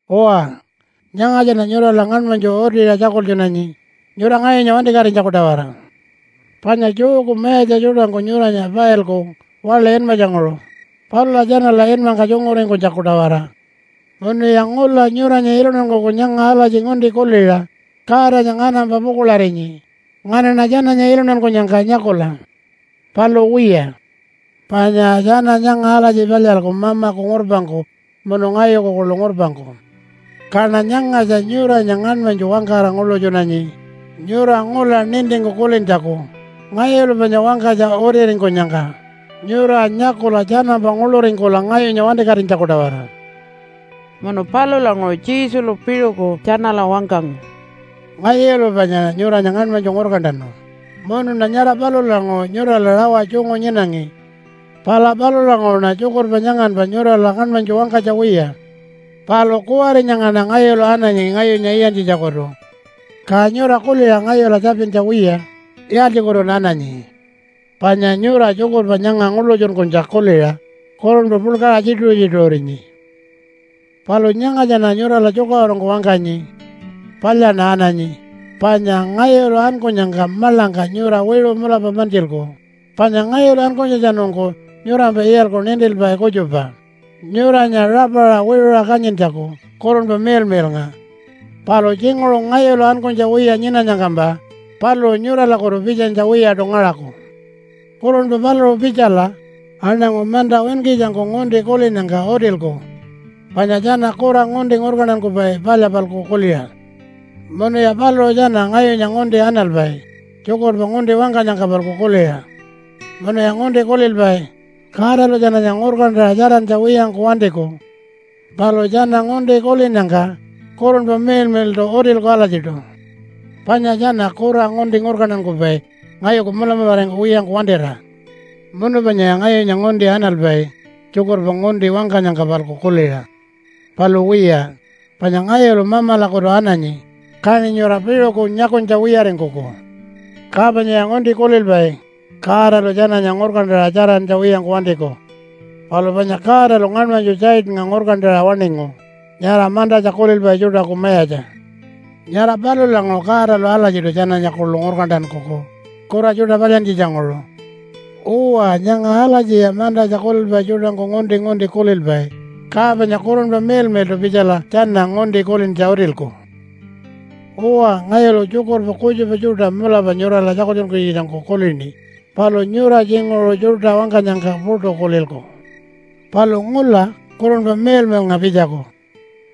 “Uwa, nyangatjaṉa nyurala ngaṉmanytju utiṟa tjakultjunanyi nyura ngayunya wantikatinytjaku-tawara. Panya Jewku mayatja tjuṯangku nyuranya pailku waḻi inmatjanguṟu palula tjanala inmangka tjunguringkunytjaku-tawara. Munuya ngula nyuranya iluntankuku nyanga alatji ngunti kuliṟa, ‘Godanya nganampa pukuḻarinyi nganaṉa tjananya iluntankunyangka nyakula.’ Palu wiya. Panya tjana nyanga alatji palyalku Mamaku ngurpangku munu ngayuku kuḻu ngurpangku. Kaṉa nyangatja nyuranya ngaṉmanytju wangkara nguḻutjunanyi nyura ngula nintingku kulintjaku ngayulu panya wangkanytja utiringkunyangka nyura nyakula tjanampa nguḻuringkula ngayunya wantikatinytjaku-tawara.” Munu palulanguṟu Jesulu piṟuku tjanala wangkangu, “Ngayulu panya nyuranya ngaṉmanytju ngurkantanu munuṉa nyara palulanguṟu nyurala rawa tjungu nyinangi. Pala palulanguṟuṉa tjukurpa nyanganpa nyurala ngaṉmanytju wangkanytja wiya. Palu kuwari nyangaṉa ngayulu ananyi ngayunya iyantjitjakutu. Ka nyura kuliṟa ngayula tjapintja wiya, ‘Yaaltjikutun ananyi?’ Panya nyura tjukurpa nyanga nguḻutjunkunytja kuliṟa kurunpa puḻkaṟa tjituṟu-tjituṟurinyi. “Palu nyangatjaṉa nyurala tjukaṟurungku wangkanyi. Palyaṉa ananyi, panya ngayulu ankunyangka maḻangka nyura wiṟu mulapa mantjilku, panya ngayulu ankunytjatjanungku nyurampa iyalku Nintilpai kutjupa nyuranya rapaṟa wiṟuṟa kanyintjaku, Kurunpa Miḻmiḻnga. Palu tjinguṟu ngayulu ankunytja wiya nyinanyangkampa paluṟu nyuralakutu pitjanytja wiyaṯu ngaṟaku. Kurunpa paluṟu pitjala aṉangu manta winkitjangku ngunti kulinnyangka utilku. Panya tjana kura ngunti ngurkantankupai palya-palku kuliṟa. Munuya paluṟu tjana ngayunya ngunti analpai tjukurpa ngunti wangkanyangka-palku kuliṟa. Munuya ngunti kulilpai Godalu tjananya ngurkantaṟa tjarantja wiyangku wantiku. Palu tjana ngunti kulinnyangka Kurunpa Miḻmiḻṯu utilku alatjiṯu. Panya tjana kura ngunti ngurkantankupai ngayuku mulamularingkuwiyangku wantira. Munu panyaya ngayunya ngunti analpai tjukurpa ngunti wangkanyangka-palku kuliṟa. Palu wiya, panya ngayulu Mamalakutu ananyi, kaṉi nyura piṟuku nyakunytja wiyaringkuku. Ka panyaya ngunti kulilpai Godalu tjananya ngurkantaṟa tjarantja wiyangku wantiku. Palu panya Godalu ngaṉmanytju Satannga ngurkantaṟa waṉingu nyara mantatja kulilpai tjuṯaku mayatja. Nyara palulanguṟu Godalu alatjiṯu tjananya kuḻu ngurkantankuku kura tjuṯa palyantjitjanguṟu. Uwa, nyanga alatjiya mantatja kulilpai tjuṯangku ngunti-ngunti kulilpai, ka panya Kurunpa Miḻmiḻṯu pitjala tjana ngunti kulintja utilku. “Uwa, ngayulu tjukurpa kutjupa tjuṯa mulapa nyurala tjakultjunkunytjikitjangku kulini, palu nyura tjinguṟu tjuṯa wangkanyangka puṯu kulilku. Palu ngula Kurunpa Miḻmiḻnga pitjaku.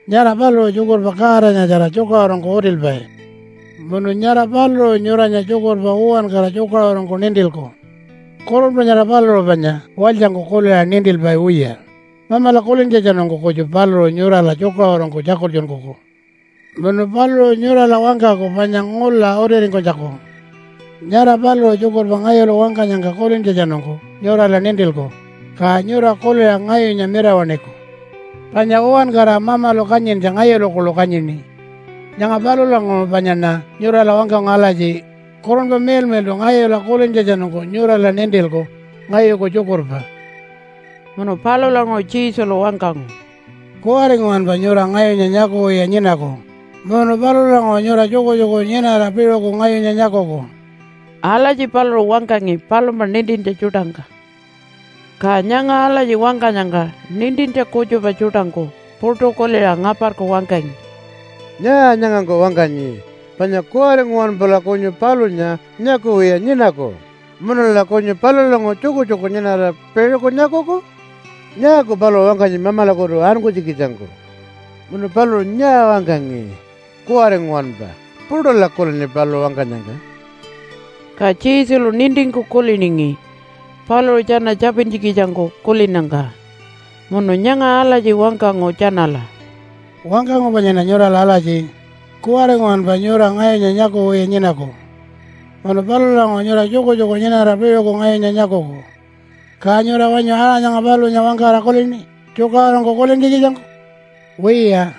Nyara paluṟu tjukurpa Godanyatjara tjukaṟurungku utilpai. Munu nyara paluṟu nyuranya tjukurpa uwankara tjukaṟurungku nintilku. Kurunpa nyara paluṟu panya walytjangku kuliṟa nintilpai wiya, Mamala kulintjatjanungku kutju paluṟu nyurala tjukaṟurungku tjakultjunkuku. Munu paluṟu nyurala wangkaku panya ngula utiringkunytjaku. Nyara paluṟu tjukurpa ngayulu wangkanyangka kulintjatjanungku nyurala nintilku, ka nyura kuliṟa ngayunya mirawaṉiku. Panya uwankara Mamalu kanyintja ngayulu kuḻu kanyini. Nyanga palulanguṟu panyaṉa nyurala wangkangu alatji, ‘Kurunpa Miḻmiḻṯu ngayula kulintjatjanungku nyurala nintilku ngayuku tjukurpa.’” Munu palulanguṟu Jesulu wangkangu, “Kuwari nguwanpa nyura ngayunya nyakuwiya nyinaku. Munu palulanguṟu nyura tjukutjuku nyinara piṟuku ngayunya nyakuku.” Alatji paluṟu wangkangi palumpa nintintja tjuṯangka. Ka nyanga alatji wangkanyangka nintintja kutjupa tjuṯangku puṯu kuliṟa ngaparku wangkangi, “Nyaa nyangangku wangkanyi panya kuwari nguwanpala kunyu palunya nyakuwiya nyinaku, munula kunyu palulanguṟu tjukutjuku nyinara piṟuku nyakuku? Nyaaku paluṟu wangkanyi Mamalakutu ankunytjikitjangku? Munu paluṟu nyaa wangkangi, ‘kuwari nguwanpa?’ Puṯula kulini paluṟu wangkanyangka.” Ka Jesulu nintingku kuliningi paluṟu tjana tjapintjikitjangku kulinnyangka. Munu nyanga alatji wangkangu tjanala, “Wangkangu panyaṉa nyurala alatji, ‘Kuwari nguwanpa nyura ngayunya nyakuwiya nyinaku. Munu palulanguṟu nyura tjukutjuku nyinara piṟuku ngayunya nyakuku.’ Ka nyura wanyu aṟa nyanga palunya wangkara kulini tjukaṟurungku kulintjikitjangku? Wiya,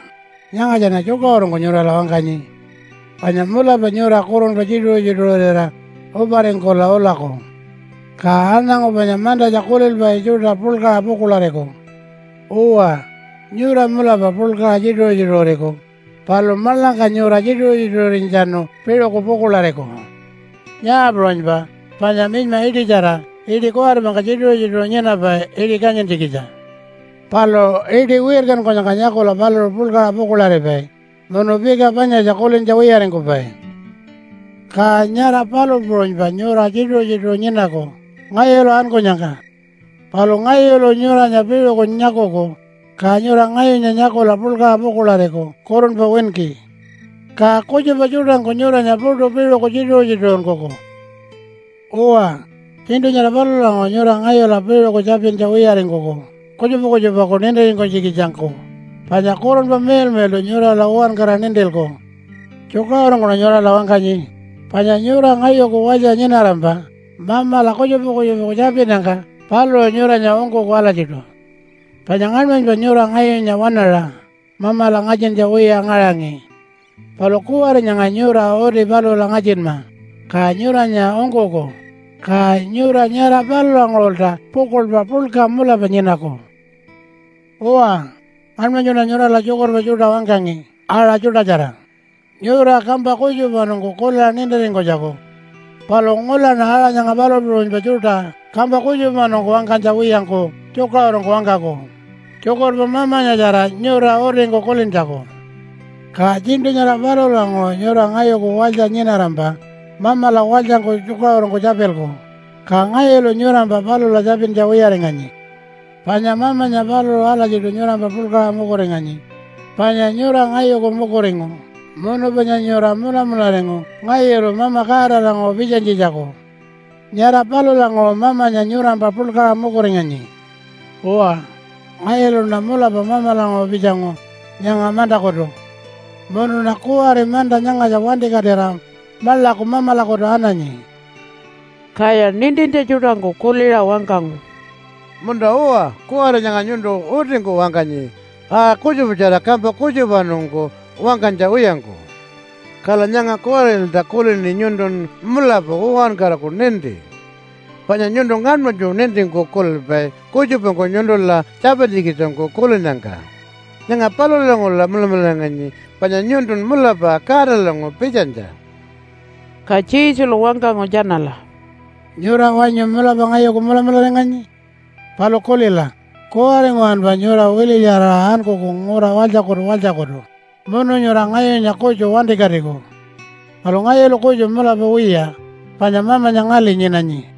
nyangatjaṉa tjukaṟurungku nyurala wangkanyi. Panya mulapa nyura kurunpa tjituṟu-tjituṟurira uparingkula ulaku. Ka aṉangu panya mantatja kulilpai tjuṯa puḻkaṟa pukuḻariku. Uwa, nyura mulapa puḻkaṟa tjituṟu-tjituṟuriku, palu maḻangka nyura tjituṟu-tjituṟurinytjatjanu piṟuku pukuḻariku. Nyaa puṟunypa, panya minyma iṯitjara iṯi kuwaripangka tjituṟu-tjituṟu nyinapai iṯi kanyintjikitja. Palu iṯi wirkankunyangka nyakula paluṟu puḻkaṟa pukuḻaripai munu pika panyatja kulintja wiyaringkupai. “Ka nyara palu puṟunypa nyura tjituṟu-tjituṟu nyinaku ngayulu ankunyangka. Palu ngayulu nyuranya piṟuku nyakuku, ka nyura ngayunya nyakula puḻkaṟa pukuḻariku kurunpa winki. Ka kutjupa tjuṯangku nyuranya puṯu piṟuku tjituṟu-tjituṟunkuku. “Uwa, tjiṉṯu nyara palulanguṟu nyura ngayula piṟuku tjapintja wiyaringkuku kutjupa kutjupaku nintiringkunytjikitjangku, panya Kurunpa Miḻmiḻṯu nyurala uwankara nintilku. Tjukaṟurungkuṉa nyurala wangkanyi, panya nyura ngayuku walytja nyinarampa Mamala kutjupa kutjupaku tjapinnyangka paluṟu nyuranya ungkuku alatjiṯu. Panya ngaṉmanypa nyura ngayunya waṉaṟa Mamala ngatjintja wiya ngaṟangi. Palu kuwari nyanga nyura uti palula ngatjinma, ka nyuranya ungkuku, ka nyura nyara palulanguṟulta pukuḻpa puḻka mulapa nyinaku. “Uwa, ngaṉmanytjuṉa nyurala tjukurpa tjuṯa wangkangi aṟa tjuṯatjara nyura kampa kutjupawanungku kuliṟa nintiringkunytjaku. Palu ngulaṉa aṟa nyanga palu puṟunypa tjuṯa kampa kutjupawanungku wangkanytja wiyangku tjukaṟurungku wangkaku tjukurpa Mamanyatjara nyura utingku kulintjaku. Ka tjiṉṯu nyara palulanguṟu nyura ngayuku walytja nyinarampa Mamala walytjangku tjukaṟurungku tjapilku, ka ngayulu nyurampa palula tjapintja wiyaringanyi. Panya Mamanya paluṟu alatjiṯu nyurampa puḻkaṟa mukuringanyi, panya nyura ngayuku mukuringu munu panya nyura mulamularingu ngayulu Mama Godalanguṟu pitjanytjitjaku. Nyara palulanguṟu Mamanya nyurampa puḻkaṟa mukuringanyi. Uwa, ngayuluṉa mulapa Mamalanguṟu pitjangu nyanga mantakutu. Munuṉa kuwari manta nyangatja wantikatira maḻaku Mamalakutu ananyi.” Kaya nintintja tjuṯangku kuliṟa wangkangu, “Munta-uwa, kuwari nyanga nyuntu utingku wangkanyi aṟa kutjupatjara kampa kutjupawanungku wangkanytja wiyangku. Kala nyanga kuwarilta kulini nyuntun mulapa uwankaraku ninti. Panya nyuntu ngaṉmanytju nintingku kulilpai kutjupangku nyuntula tjapintjikitjangku kulinnyangka. Nyanga palulanguṟula mulamularinganyi panya nyuntun mulapa Godalanguṟu pitjanytja.” Ka Jesulu wangkangu tjanala, “Nyura wanyu mulapa ngayuku mulamularinganyi? Palu kulila, kuwari nguwanpa nyura wililyaraṟa ankuku ngura walytjakutu walytjakutu munu nyura ngayunya kutju wantikatiku. Palu ngayulu kutju mulapa wiya panya Mamanya ngali nyinanyi.